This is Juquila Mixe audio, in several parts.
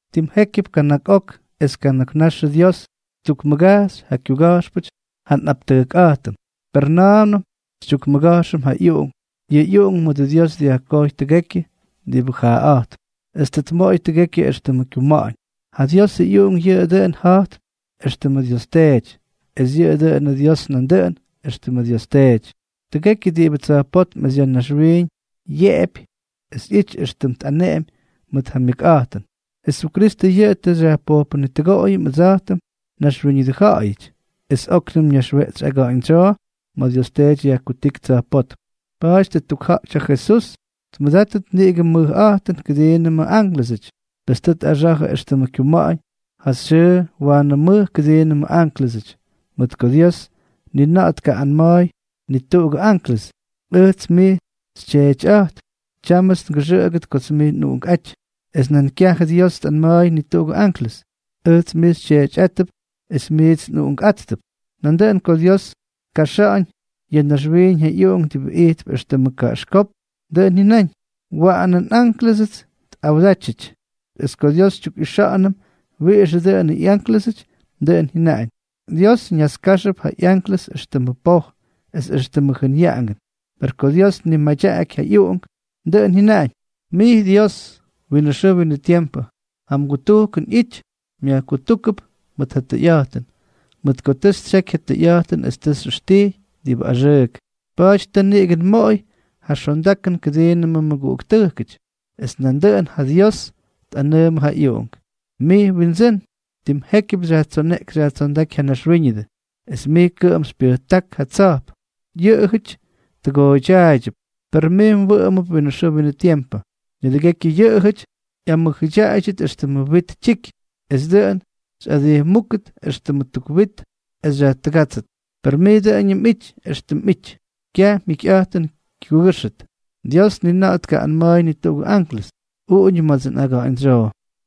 Tim jékyʉp kana̱k ok es kana̱k naxʉ Dios ttukmʉgajxy ja kyuga̱jxpʉty ja nꞌaptʉjkꞌa̱jtʉm, per na̱a̱mnʉm xytyukmʉga̱jxʉm ja ꞌyUꞌunk. Yʉ ꞌyUꞌunk mʉdʉ Dios dyajkojy tʉgekyʉ diꞌibʉ jaaꞌa̱jtp, es tʉ tmoꞌoy tʉgekyʉ éxtʉmʉ kyuma̱ꞌa̱ñ. Ja Diosʉ ꞌyUꞌunk yʉꞌʉ dʉꞌʉn ja̱jp éxtʉmʉ Dios Teety, es yʉꞌʉ dʉꞌʉnʉ Dios nandʉꞌʉn éxtʉmʉ Dios Teety. Tʉgekyʉ diꞌibʉ tsa̱jpótm es ya̱ naxwiiñ yeꞌepy es ꞌyity éxtʉm tꞌaneꞌemy mʉt ja myʉkꞌa̱jtʉn. Jesukristʉ yʉꞌʉ tʉ xyajpojpʉnitʉgoꞌoyʉm ʉdsa̱jtʉm naxwíñʉdʉ ja̱ꞌa̱yʉty, es óknʉm ñaxweꞌtsy aga̱ꞌa̱ñdsyoo ma̱ Dios Teety yajkutíky tsa̱jpótm. Pa̱a̱ty tʉ ttukja̱ꞌty ja Jesús tʉmʉdátʉt niꞌigʉ mʉjꞌa̱jtʉn kʉdiinʉmʉ ánklʉsʉty, pes tʉ tꞌaxa̱jʉ éxtʉmʉ kyuma̱ꞌa̱ñ ja xyʉʉ waanʉ mʉj kʉdiinʉmʉ ánklʉsʉty. Mʉt ko Dios ni na̱ꞌa̱ tkaꞌꞌanma̱a̱y ni tuꞌugʉ anklʉs: Ʉjts mij xyTyeetyꞌa̱jtp. Tyámʉts ngʉxʉꞌʉgʉt kots mij nꞌUꞌunkꞌáty. Es nan kyajʉ Dios tꞌanma̱a̱y ni tuꞌugʉ anklʉs: Ʉjts mij xyTyeetyꞌátʉp, es mijts nꞌUꞌunkꞌátʉp. Nandʉꞌʉn ko Dios tkaxa̱ꞌa̱ñ ya̱ naxwiiñ ja ꞌYuꞌunk diꞌibʉ ijtp éxtʉmʉ kaꞌaxkópk, dʉꞌʉn jyʉnaꞌañ: Waꞌanʉ nꞌánklʉsʉts tꞌawdátyʉty. Es ko Dios xytyukꞌixa̱ꞌa̱nʉm wiꞌixʉ dʉꞌʉnʉ ꞌyánklʉsuty, dʉꞌʉn jyʉnaꞌañ: Dios ñaskajxʉp ja ꞌyanklʉs éxtʉmʉ poj, es éxtʉmʉ jʉnyaꞌangʉn. Per ko Dios tnimadyaꞌaky ja ꞌyUꞌunk, dʉꞌʉn jyʉnaꞌañ: Mij Dios, winʉ xʉʉ winʉ tiempʉ ja mgutujkʉn ꞌyity, myajkutúkʉp mʉt ja tʉyꞌa̱jtʉn. Mʉt ko tʉ xytsyeky ja tʉyꞌa̱jtʉn es tʉ xyꞌʉxtijy diꞌibʉ axʉʉk; pa̱a̱ty tʉ niꞌigʉ nmoꞌoy ja xondakʉn kʉdiinʉmʉ mmʉguꞌuktʉjkʉty. Es nandʉꞌʉn ja Dios tꞌanʉʉmʉ ja ꞌyUꞌunk: Mij Windsʉ́n, tim jékyʉp xyajtsoneꞌky xyajtsondáky ja naxwíñʉdʉ, es mij kʉꞌʉm xypyʉjtáky ja tsa̱jp. Yʉꞌʉjʉty tʉgooydyaꞌaydyʉp, per mij mwʉꞌʉmʉp winʉ xʉʉ winʉ tiempʉ. Nidʉgekyʉ yʉꞌʉjʉty ꞌyamʉjʉdyaꞌayʉt éxtʉmʉ wit tyiky; es dʉꞌʉn xyꞌadijmúkʉt éxtʉmʉ tuk wit, es xyajtʉgátsʉt, per mij dʉꞌʉñʉm mꞌity éxtʉm mꞌity, kyaj mjikyꞌa̱jtʉn kyukʉ́xʉt. Dios ni na̱ꞌa̱ tkaꞌꞌanma̱a̱y ni tuꞌugʉ anklʉs: Uꞌuñʉ ma̱ts nꞌaga̱ꞌa̱ñdsyoo,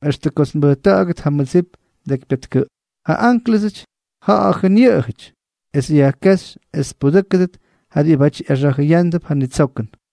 extʉ kots nbʉjta̱ꞌa̱gʉt ja mmʉdsip mdekypyatkʉꞌp. Ja ánklʉsʉty, ja̱ꞌa̱jʉn yʉꞌʉjʉty, es yajkéxy es tpudʉ́kʉdʉt ja diꞌibáty ꞌyaxa̱jʉyándʉp ja nitsokʉn.